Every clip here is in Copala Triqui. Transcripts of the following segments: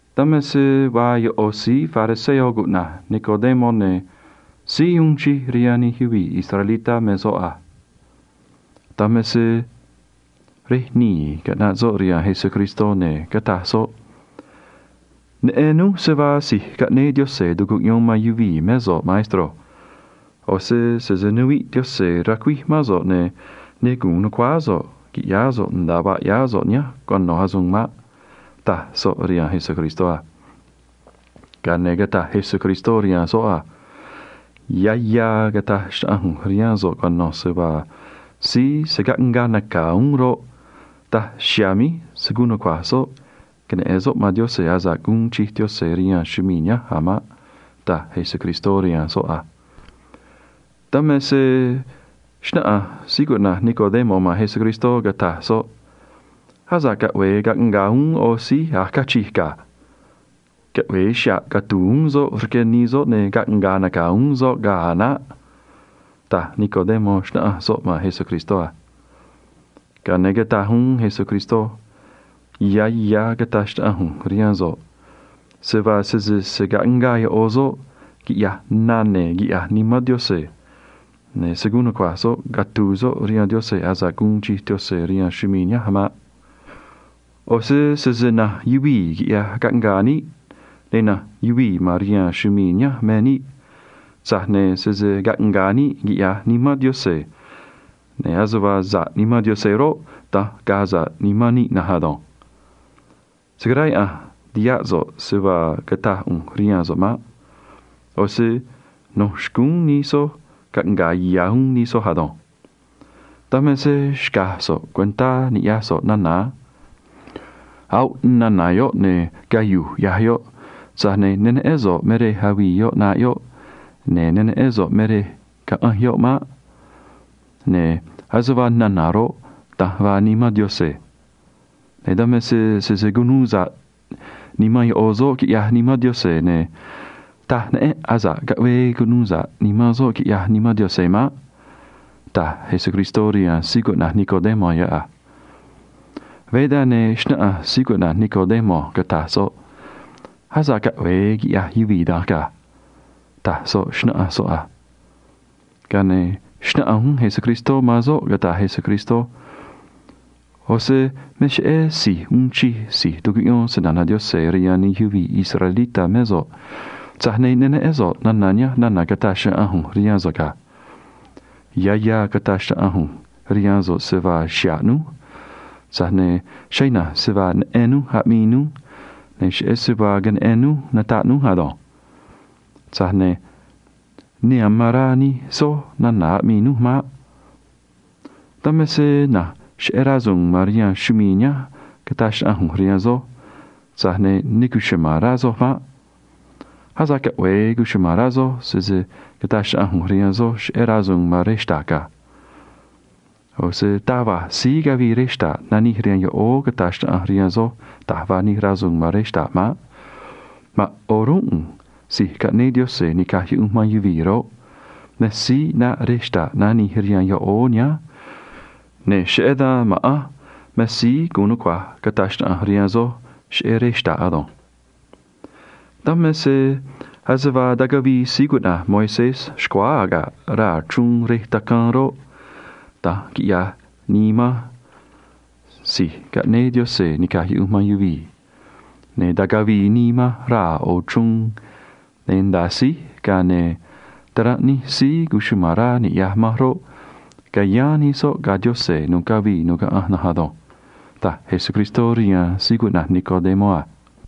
Dan me se vaa yoꞌo̱ síí fariseo cuꞌna̱j Nicodemo, ne̱ síí uun chij rihaan nij yuvii̱ israelitá me soꞌ a. Dan me se rej nii̱ caꞌnaꞌ soꞌ rihaan Jesucristó, ne̱ cataj soꞌ: ―Neꞌen núj se vaa si̱j caꞌnéé Diose̱ tu̱cuꞌyón man yuvii̱ mé so̱ꞌ, maestro. ꞌO̱ se sese nuviꞌ Diose̱ racuíj mán so̱ꞌ, ne̱ ne gu̱un nu̱cuáá so̱ꞌ qui̱ꞌyáá so̱ꞌ nda̱a vaa ꞌyáá so̱ꞌ nihánj cuano̱ asuun maꞌ ―taj soꞌ rihaan Jesucristó a. Ga̱a ne̱ cataj Jesucristó rihaan soꞌ a: ―Ya̱ ya̱ cata̱j xnaꞌanj ꞌu̱nj rihaan so̱ꞌ cuano̱ se vaa síí se̱ caꞌngaa naca̱ uún roꞌ, daj chiha̱a̱ míj se̱ guun nucua̱j soꞌ queneꞌe̱n soꞌ man Diose̱ asa̱ꞌ guun chij Diose̱ rihaan chumii̱ nihánj a̱ maꞌ ―taj Jesucristó rihaan soꞌ a. Dan me se xnáꞌanj síí cuꞌna̱j Nicodemo man Jesucristó, cataj soꞌ: ―Asa̱ꞌ caꞌve̱e caꞌnga̱a̱ uún ꞌo̱ síí a̱j cachij ga̱. Caꞌve̱e xa̱ꞌ catu̱u̱ uún soꞌ rque nii soꞌ ne̱ caꞌnga̱a̱ naca̱ uún soꞌ ga̱a̱ a̱ naꞌ ―taj Nicodemo, xnáꞌanj soꞌ man Jesucristó a. Ga̱a ne̱ cataj uún Jesucristó: ―Ya̱ ya̱ cata̱j xnaꞌanj ꞌu̱nj rihaan so̱ꞌ se vaa sese se̱ caꞌngaa yoꞌo̱ soꞌ quiꞌya̱j na ne̱ quiꞌya̱j Nimán Diose̱, ne̱ se̱ guun nucua̱j soꞌ catu̱u̱ soꞌ rihaan Diose̱ asa̱ꞌ guun chij Diose̱ rihaan chumii̱ nihánj maꞌ. ꞌO̱ se sese na̱nj yuvii̱ quiꞌyaj caꞌngaa níꞌ, ne̱ na̱nj yuvii̱ ma̱n rihaan chumii̱ nihánj me níꞌ, tza̱j ne̱ sese caꞌnga̱a̱ níꞌ quiꞌya̱j Nimán Diose̱, ne̱ ase vaa sa̱ꞌ Nimán Diose̱ roꞌ, da̱nj ga̱a̱ sa̱ꞌ nimán níꞌ na̱nj ado̱nj. Se̱ caráyaꞌa̱nj tiháꞌ so̱ꞌ se vaa cataj ꞌu̱nj rihaan so̱ꞌ maꞌ. ꞌO̱ se no̱ xcúún nij soj caꞌnga̱a̱ ya̱ uún nij soj ado̱nj. Dan me se xca̱j so̱ꞌ cuentá ni̱ꞌyaj so̱ꞌ nana̱ a. Avii nana̱ yoꞌ, ne̱ cayu̱j ꞌyaj yoꞌ, tza̱j ne̱ ne neꞌén so̱ꞌ me rej avii yoꞌ ꞌnaꞌ yoꞌ, ne̱ ne neꞌén so̱ꞌ me rej caꞌanj yoꞌ maꞌ. Ne̱ ase vaa nana̱ roꞌ, da̱nj vaa Nimán Diose̱, ne̱ dan me se sese cunuu sa̱ꞌ nimán yoꞌo̱ soꞌ quiꞌyaj Nimán Diose̱, ne̱ taj neꞌénꞌ asa̱ꞌ caꞌvee cunuu sa̱ꞌ nimán soꞌ quiꞌyaj Nimán Diose̱ maꞌ ―taj Jesucristó rihaan síí cuꞌna̱j Nicodemo yoꞌ a. Veé dan, ne̱ xnáꞌanj síí cuꞌna̱j Nicodemo, cataj soꞌ: ―Asa̱ꞌ caꞌve̱e quiꞌya̱j yuvii̱ da̱nj ga̱ ―taj soꞌ, xnáꞌanj soꞌ a. Ga̱a ne̱ xnáꞌanj uún Jesucristó man soꞌ, cataj Jesucristó: ―ꞌO̱ se me cheꞌé si̱j uun chij si̱j tucuꞌyón se‑na̱na̱ Diose̱ rihaan nij yuvii̱ israelitá mé so̱ꞌ, tza̱j ne̱ ne neꞌén so̱ꞌ nana̱ nihánj nana̱ cataj ꞌu̱nj rihaan so̱ꞌ ga̱. Ya̱ ya̱ cata̱j xnaꞌanj ꞌu̱nj rihaan so̱ꞌ se vaa xa̱ꞌ núj, tza̱j ne̱ cheꞌé ina̱nj se vaa neꞌen núj aꞌmii núj ne̱ cheꞌé se vaa queneꞌen núj nataꞌ núj ado̱nj. Tza̱j ne̱ ne amán rá nij soj nana̱ aꞌmii núj maꞌ. Dan me se na̱nj cheꞌé rasu̱u̱n ma̱n rihaan chumii̱ nihánj cataj xnaꞌanj ꞌu̱nj rihaan soj, tza̱j ne̱ ne cuchuma̱n rá soj maꞌ. Asa̱ꞌ caꞌve̱e cuchuma̱n rá soj sese cata̱j xnaꞌanj ꞌu̱nj rihaan soj cheꞌé rasu̱u̱n ma̱n rej xta̱ꞌ ga̱. ꞌO̱ se taj va̱j síí cavii rej xta̱ꞌ nanij rihaan yoꞌóó cata̱j xnaꞌanj rihaan soj da̱j vaa nij rasu̱u̱n ma̱n rej xta̱ꞌ maꞌ. Ma̱a̱n o̱rúnꞌ ꞌu̱nj si̱j caꞌnéé Diose̱ ni̱caj yuꞌunj man yuvii̱ roꞌ, me síí ꞌnaꞌ rej xta̱ꞌ nanij rihaan yoꞌóó nihánj, ne̱ cheꞌé dan ma̱ꞌanj me síí gu̱un nucua̱j cata̱j xnaꞌanj rihaan soj cheꞌé rej xta̱ꞌ ado̱nj. Dan me se ase vaa tacavii síí cuꞌna̱j Moisés xcuáá aga̱ꞌ raa̱ chruun rej tacaan roꞌ, da̱nj quiꞌya̱j nii manj si̱j caꞌnéé Diose̱ ni̱caj yuꞌunj man yuvii̱, ne̱ ta̱cavii nii manj raa̱ ꞌo̱ chruun, ne̱ nda̱a síj, ga̱a ne̱ taranꞌ nij síí cuchuma̱n rá ni̱ꞌyaj manj roꞌ, ca̱yáán nij soꞌ ga̱ Diose̱ nu̱ꞌ cavii nu̱ꞌ caꞌanj na̱nj ado̱nj ―taj Jesucristó rihaan síí cuꞌna̱j Nicodemo a.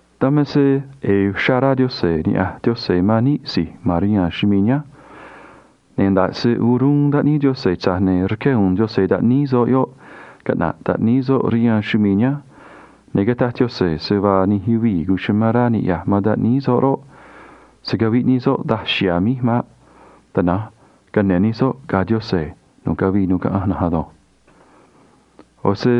Dan me se ꞌe̱e̱ uxrá rá Diose̱ niꞌya̱j Diose̱ man níꞌ si̱j ma̱n rihaan chumii̱ nihánj, ne̱ nda̱ꞌ se o̱rúnꞌ taꞌníí Diose̱, tza̱j ne̱ rqué u̱u̱n Diose̱ taꞌníí soꞌ yoꞌ, caꞌna̱ꞌ taꞌníí soꞌ rihaan chumii̱ nihánj, ne̱ cataj Diose̱ se vaa nij yuvii̱ amán rá niꞌya̱j man taꞌníí soꞌ roꞌ, se̱ caviꞌ nij soꞌ daj chiha̱a̱ míj maꞌ. Tana̱nj cane̱ nij soꞌ ga̱ Diose̱ nu̱ꞌ cavii nu̱ꞌ caꞌanj na̱nj ado̱nj. ꞌO̱ se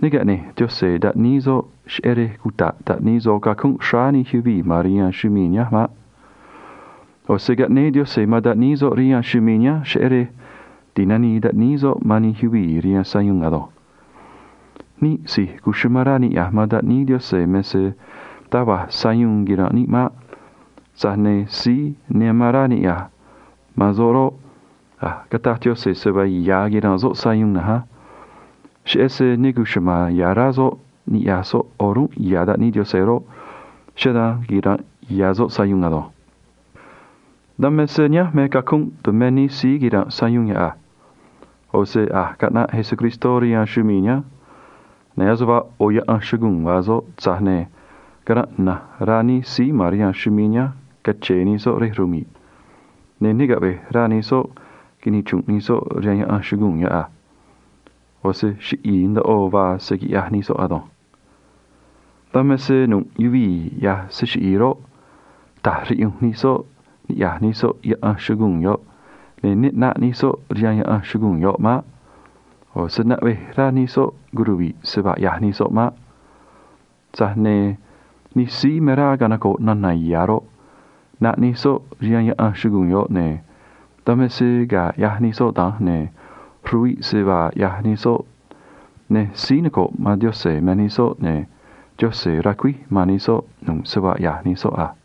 ne caꞌne̱j Diose̱ taꞌníí soꞌ cheꞌé rej cuta̱ꞌ taꞌníí soꞌ cacunꞌ xráá nij yuvii̱ ma̱n rihaan chumii̱ nihánj maꞌ. Tana̱nj caꞌnéé Diose̱ man taꞌníí soꞌ rihaan chumii̱ nihánj cheꞌé rej ti̱nanii taꞌníí soꞌ man nij yuvii̱ rihaan chrej chiꞌi̱i̱ uun chij nimán nij soꞌ ado̱nj. Níꞌ si̱j amán rá niꞌya̱j man taꞌníí Diose̱ me se taj va̱j sayuun quira̱nꞌ níꞌ maꞌ. Tza̱j ne̱ síí ne amán rá niꞌya̱j man soꞌ roꞌ, a̱j cataj Diose̱ se vaa ya̱ quira̱nꞌ soꞌ sayuun na̱nj á. Cheꞌé se ne cuchuma̱n ya̱ rá soꞌ niꞌya̱j soꞌ o̱rúnꞌ ya̱ taꞌníí Diose̱ roꞌ, cheꞌé dan quira̱nꞌ ya̱ soꞌ sayuun ado̱nj. Dan me se nihánj me cacunꞌ tumé nij síí quira̱nꞌ sayuun yoꞌ a. ꞌO̱ se a̱j caꞌnaꞌ Jesucristó rihaan chumii̱ nihánj, ne̱ ase vaa ꞌo̱ yaꞌan chuguu̱n vaa soꞌ, tza̱j ne̱ caranꞌ ina̱nj rá nij síí ma̱n rihaan chumii̱ nihánj cache̱e̱ nij soꞌ rej rmi̱ꞌ, ne̱ ne caꞌve̱j rá nij soꞌ quinichru̱nꞌ nij soꞌ rihaan yaꞌan chuguu̱n yoꞌ a. ꞌO̱ se chiꞌi̱i̱ ndoꞌo vaa se quiꞌyaj nij soꞌ ado̱nj. Dan me se nu̱ꞌ yuvii̱ ꞌyaj se chiꞌi̱i̱ roꞌ, ta̱j riꞌyunj nij soꞌ niꞌya̱j nij soꞌ yaꞌan chuguu̱n yoꞌ, ne̱ ne ꞌnaꞌ nij soꞌ rihaan yaꞌan chuguu̱n yoꞌ maꞌ. ꞌO̱ se naꞌvej rá nij soꞌ curuvi̱ꞌ se vaa ꞌyaj nij soꞌ maꞌ. Tza̱j ne̱ nij síí me rá canoco̱ꞌ nana̱ ya̱ roꞌ, ꞌnaꞌ nij soꞌ rihaan yaꞌan chuguu̱n yoꞌ, ne̱ dan me se ga̱a ꞌyaj nij soꞌ da̱nj, ne̱ ruviꞌ se vaa ꞌyaj nij soꞌ, ne̱ síí noco̱ꞌ man Diose̱ me nij soꞌ, ne̱ Diose̱ racuíj man nij soꞌ nu̱ꞌ se vaa ꞌyaj nij soꞌ a.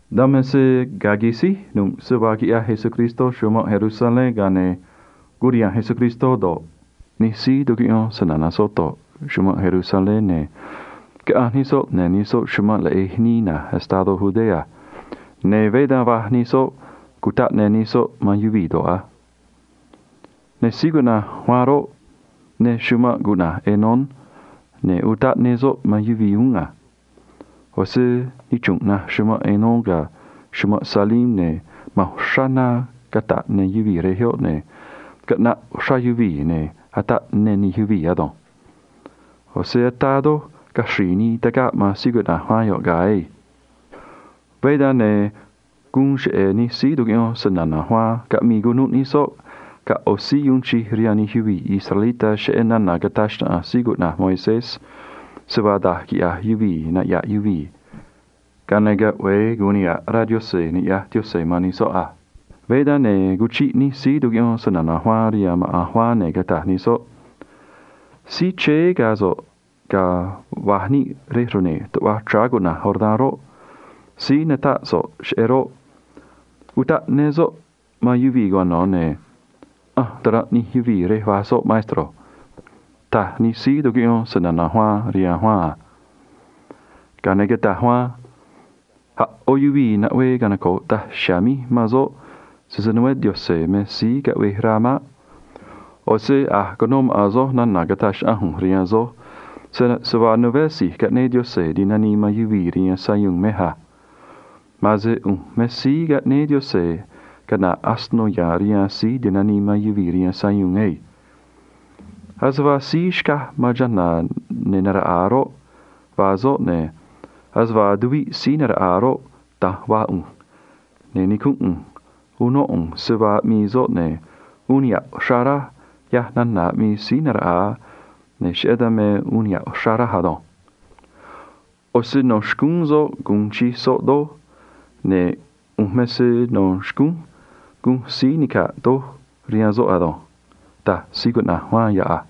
Dan me se ga̱a quisíj nu̱ꞌ se vaa quiꞌyaj Jesucristó chumanꞌ Jerusalén, ga̱a ne̱ curiha̱nj Jesucristó do̱ꞌ, nij síí tucuꞌyón se‑na̱na̱ soꞌ do̱ꞌ, chumanꞌ Jerusalén, ne̱ caꞌanj nij soꞌ ne̱ nij soꞌ chumanꞌ leꞌe̱j nii na̱j estadó Judea, ne̱ veé dan va̱j nij soꞌ cutaꞌ ne nij soꞌ man yuvii̱ do̱ꞌ a. Ne̱ síí cuꞌna̱j Juan roꞌ, ne chumanꞌ cuꞌna̱j Enón, ne̱ utaꞌ ne soꞌ man yuvii̱ uún a. ꞌO̱ se nichru̱nꞌ naj chumanꞌ Enón ga̱ chumanꞌ Salim, ne̱ ma̱n uxrá na cata̱ꞌ ne yuvii̱ rej yoꞌ, ne̱ caꞌnaꞌ uxrá yuvii̱, ne̱ ataꞌ ne nij yuvii̱ ado̱nj. ꞌO̱ se ataa doj caxri̱i̱ nii tagaꞌ man síí cuꞌna̱j Juan yoꞌ ga̱a̱ ei. Veé dan, ne̱ guun cheꞌe̱ nij síí tucuꞌyón se‑na̱na̱ Juan caꞌmii cunuꞌ nij soꞌ ga̱ ꞌo̱ síí uun chij rihaan nij yuvii̱ israelitá cheꞌé nana̱ cataj xnaꞌanj síí cuꞌna̱j Moisés, se vaa da̱j quiꞌya̱j yuvii̱ naꞌya̱ꞌ yuvii̱, ga̱a ne̱ caꞌve̱e gu̱un niha̱ꞌ rá Diose̱ ni̱ꞌyaj Diose̱ man nij soꞌ a. Veé dan, ne̱ cuchiꞌ nij síí tucuꞌyón se‑na̱na̱ Juan rihaan maꞌa̱n Juan, ne̱ cataj nij soꞌ: ―Síí chéé ga̱ so̱ꞌ ga̱a va̱j níꞌ rej rne̱j tuꞌva chráá cuꞌna̱j Jordán roꞌ, síí natáꞌ so̱ꞌ cheꞌé roꞌ, utaꞌ ne soꞌ man yuvii̱ cuano̱, ne̱ ꞌanj taranꞌ nij yuvii̱ rej va̱j soꞌ, maestro ―taj nij síí tucuꞌyón se‑na̱na̱ Juan rihaan Juan a. Ga̱a ne̱ cataj Juan: ―A̱ ꞌó yuvii̱ naꞌvee canoco̱ꞌ daj chiha̱a̱ míj man soꞌ, sese nuveé Dio̱se̱ me síí caꞌvej rá maꞌ. ꞌO̱ se a̱j cuno maꞌa̱n soj nana̱ cataj xnaꞌanj ꞌu̱nj rihaan soj se vaa nuveé si̱j caꞌnéé Diose̱ ti̱nanii man yuvii̱ rihaan sayuun mej a. Ma̱a̱n se ꞌu̱nj me síí caꞌnéé Diose̱ caꞌna̱ꞌ asino ya̱a̱n rihaan síí ti̱nanii man yuvii̱ rihaan sayuun ei. Ase vaa síí xcaj man chana̱ ne̱ naraꞌa̱a roꞌ, vaa soꞌ, ne̱ ase vaa tuviꞌ síí naraꞌa̱a roꞌ, da̱nj vaa ꞌu̱nj, ne̱ nicúnꞌ ꞌu̱nj unó ꞌu̱nj se vaa aꞌmii soꞌ, ne̱ uun niha̱ꞌ uxrá raj, ꞌyaj nana̱ aꞌmii síí naraꞌa̱a, ne̱ cheꞌé dan me uun niha̱ꞌ uxrá raj ado̱nj. ꞌO̱ se no̱ xcúún soꞌ gu̱un chij soꞌ doj, ne̱ ꞌu̱nj me se no̱ xcúnj gunj síí nica̱ꞌ doj rihaan soꞌ ado̱nj ―taj síí cuꞌna̱j Juan yoꞌ a.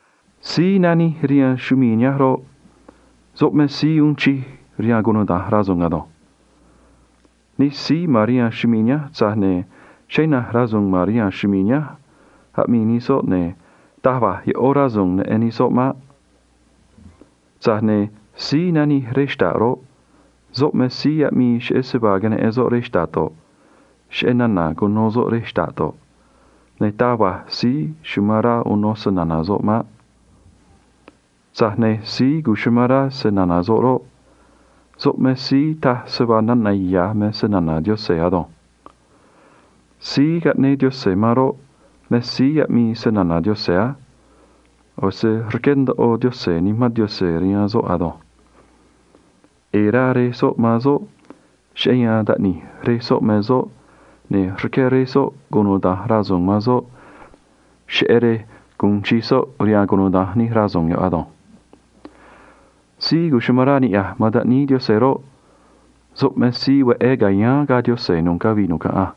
Síí nanij rihaan chumii̱ nihánj roꞌ, soꞌ me síí uun chij rihaan cunuda̱nj rasu̱u̱n ado̱nj. Nij síí ma̱n rihaan chumii̱ nihánj, tza̱j ne̱ cheꞌé ina̱nj rasu̱u̱n ma̱n rihaan chumii̱ nihánj aꞌmii nij soꞌ, ne̱ taj va̱j yoꞌó rasu̱u̱n neꞌen nij soꞌ maꞌ. Tza̱j ne̱ síí nanij rej xta̱ꞌ roꞌ, soꞌ me síí aꞌmii cheꞌé se vaa queneꞌen soꞌ rej xta̱ꞌ do̱ꞌ, cheꞌé nana̱ cuno soꞌ rej xta̱ꞌ do̱ꞌ, ne̱ taj va̱j síí amán rá uno se‑na̱na̱ soꞌ maꞌ. Tza̱j ne̱ síí amán rá se‑na̱na̱ soꞌ roꞌ, soꞌ me síí taj se vaa nana̱ ya̱ me se‑na̱na̱ Diose̱ ado̱nj. Síí caꞌnéé Diose̱ man roꞌ, me síí aꞌmii se‑na̱na̱ Diose̱ á. ꞌO̱ se rqué ndoꞌo Diose̱ Nimán Diose̱ rihaan soꞌ ado̱nj. ꞌE̱e̱ rá Rej soꞌ man soꞌ, cheꞌé yan taꞌni̱j Rej soꞌ me soꞌ, ne̱ rqué Rej soꞌ cunuda̱nj rasu̱u̱n man soꞌ, cheꞌé rej gu̱un chij soꞌ rihaan cunuda̱nj nij rasu̱u̱n yoꞌ ado̱nj. Síí amán rá niꞌya̱j man taꞌníí Diose̱ roꞌ, soꞌ me síí veꞌé ca̱yáán ga̱ Diose̱ nu̱ꞌ cavii nu̱ꞌ caꞌanj,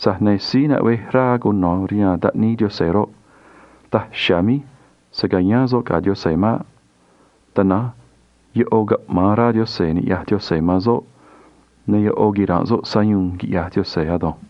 tza̱j ne̱ síí naꞌvej rá cuno̱ rihaan taꞌníí Diose̱ roꞌ, daj chiha̱a̱ míj se̱ cayáán soꞌ ga̱ Diose̱ maꞌ. Tana̱nj yoꞌo̱ caꞌma̱an rá Diose̱ ni̱ꞌyaj Diose̱ man soꞌ, ne̱ yoꞌo̱ quira̱nꞌ soꞌ sayuun, quiꞌya̱j Diose̱ ado̱nj.